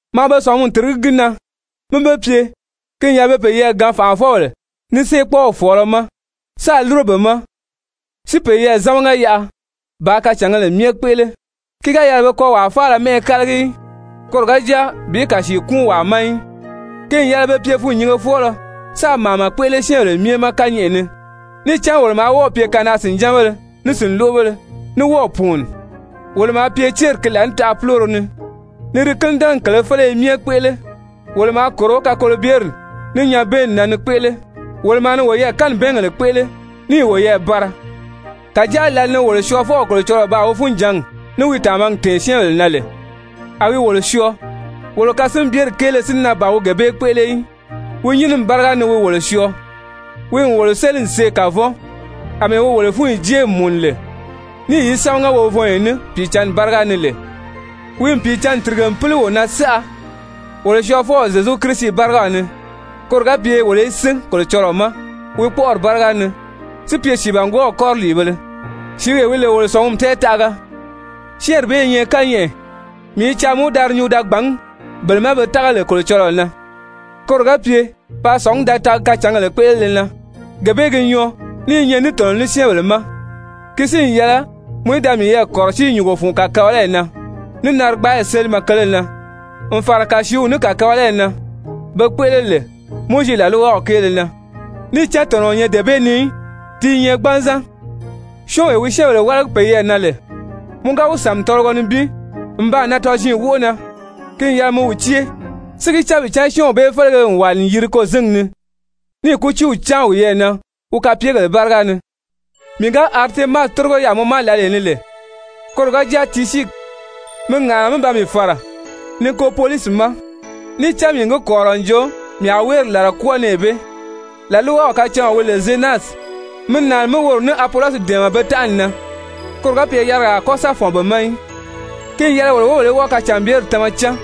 Maa be sɔ̀ngumi tìrigí gi na mí be pye, ki n yɛlɛ be peyɛɛ gaan fànʔafɔbèle ní séekpɔɔw fɔ̀ɔlɔ ma sáā lúro be ma si peyɛɛ zámaga yaʔa bàā kacǎngèle myɛ kpéʔele, ki ga yɛlɛ pe kɔ́ wàa faala mɛ́ʔɛ kálagi í, koro ga jáa bi kàsii kúun wàa ma í, ki n yɛlɛ be pye fûnnyingefɔɔlɔ sáā màama kpéʔele syɛ́ɛnbèle myɛ ma kányɛʔɛ ni. Níì cán wolo maa wɔ́ɔ̀ pye kanaa-sìnjánbéle ní sìnloʔobéle, ní wɔ́ɔ̀ pùuni, wolo maa pye céri ki laànitaʔa púloro ni, ni di kínidɛnɛgi kèlē féleye myɛ kpéʔele, wolo maa kòro kakolobyeri ní nyabɛɛnni na ni kpéʔele, wolo maa ni woyɛɛ kanibɛɛngèle kpéʔele níì woyɛɛ bara. Kàjáa lǎli ni wolo Syɔɔfɔw Kolocɔlɔɔ baa wi funjǎngi ní wi tàmagi tɛ̀ɛn syɛ́ɛnbèle na lè, a wi wolo syɔɔ, wolo kasinbyeri kéele si na ban wi gee bee kpéʔele í, wi nyínimi báriga ni wi wolo syɔɔ, wi n wolo séli n see kavɔn àmɛɛ wi wolo fúnyi jée n mùnu lè, níì yi sámaga wovɔnyɔ ní Pìicǎnni báriga ni lè. Wi n Pìicǎnni tìrige n píli wo na saʔa wolo Syɔɔfɔw Zyezu Kirisi bárigaw ni, koro ga pye wolo í sín Kolocɔlɔɔ ma wi kpɔ́ʔɔri báriga ni si pye sìibangwɔɔw kɔriliibéle, sìíwee wi lè wolo sɔ̀ngumi tɛɛtaʔaga. Syɛ́ɛnri bee i nyɛ kányɛʔɛ, mii i caa mɔ í da di nyuu da gbàngí bele ma be tága lè Kolocɔlɔɔ na, koro ga pye paa sɔ̀ngí da taagi kacǎngèle kpéʔelele na. Gee bee gi nyɔɔ ní i nyɛ ní tɔ̀nɔ ní syɛ́ɛnbèle ma! Ki si n yɛlɛ mɔ í da miyɛɛ kɔ̀rɔsíi nyùngo fun kàkabalayi na, ní narigbaayi sélimɛ kele na n fàra kàsiiw ní kàkabalayi na be kpéʔele lè Mowizi làlwaw kéele na, níì cán tɔ̀nɔ o nyɛ dee bee ni í, ti i nyɛ gbanzan. Syɔ́ɔnwee wi syɛ́ɛnbèle wálagi peyɛɛ na lè, mɔ ga wi sàmi tɔlɔgɔ nibin n baa nan tɔziin wóʔo na, ki n yɛlɛ mi wi cée, si gi cán bi cán syɔ́ɔnw bee félege n wàli n yiri kôzingi ni, níì kútiiw cáan wiyɛɛ na wi kapeegèle báriga ni. Mii ga Aritemasi tórigo yaà mɔ ma lǎlee ni lè, koro ga jáa Tisyiki, mi ŋàʔana mí ba mii fàra Nikopolisi ma, níì cán mii n gi kɔ̀rirɔ n jo mii a wéeri làla kwɔ́ɔ nɛɛ bee. Làlwaw kacáɔn wi lè Zenasi, mi nàani mí woro ní Apolɔsi dɛ̀ɛmɛ be tánʔani na, koro ga pye yarigaa a kɔ́ sa fɔ̀n be ma í. Ki n yɛlɛ wolo wóbèle í wɔ́ɔ kacànbyeri tama cán,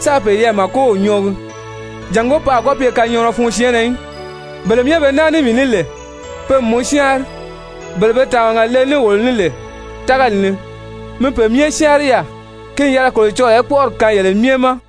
sáā peyɛɛ màkow nyɔɔgi, jàngó pe a kɔ́ pye kanyɔɔnɔ fun syɛɛnnɛ í. Bele myɛ be naa ní mii ní lè, pe n mɔ syáanri. Bele be tàmaga le ní wolo ní lè tágali ni, mi pe myɛ syáanri yaà. Ki n yɛlɛ Kolocɔlɔɔ í kpɔ́ʔɔri kaan yele myɛ ma!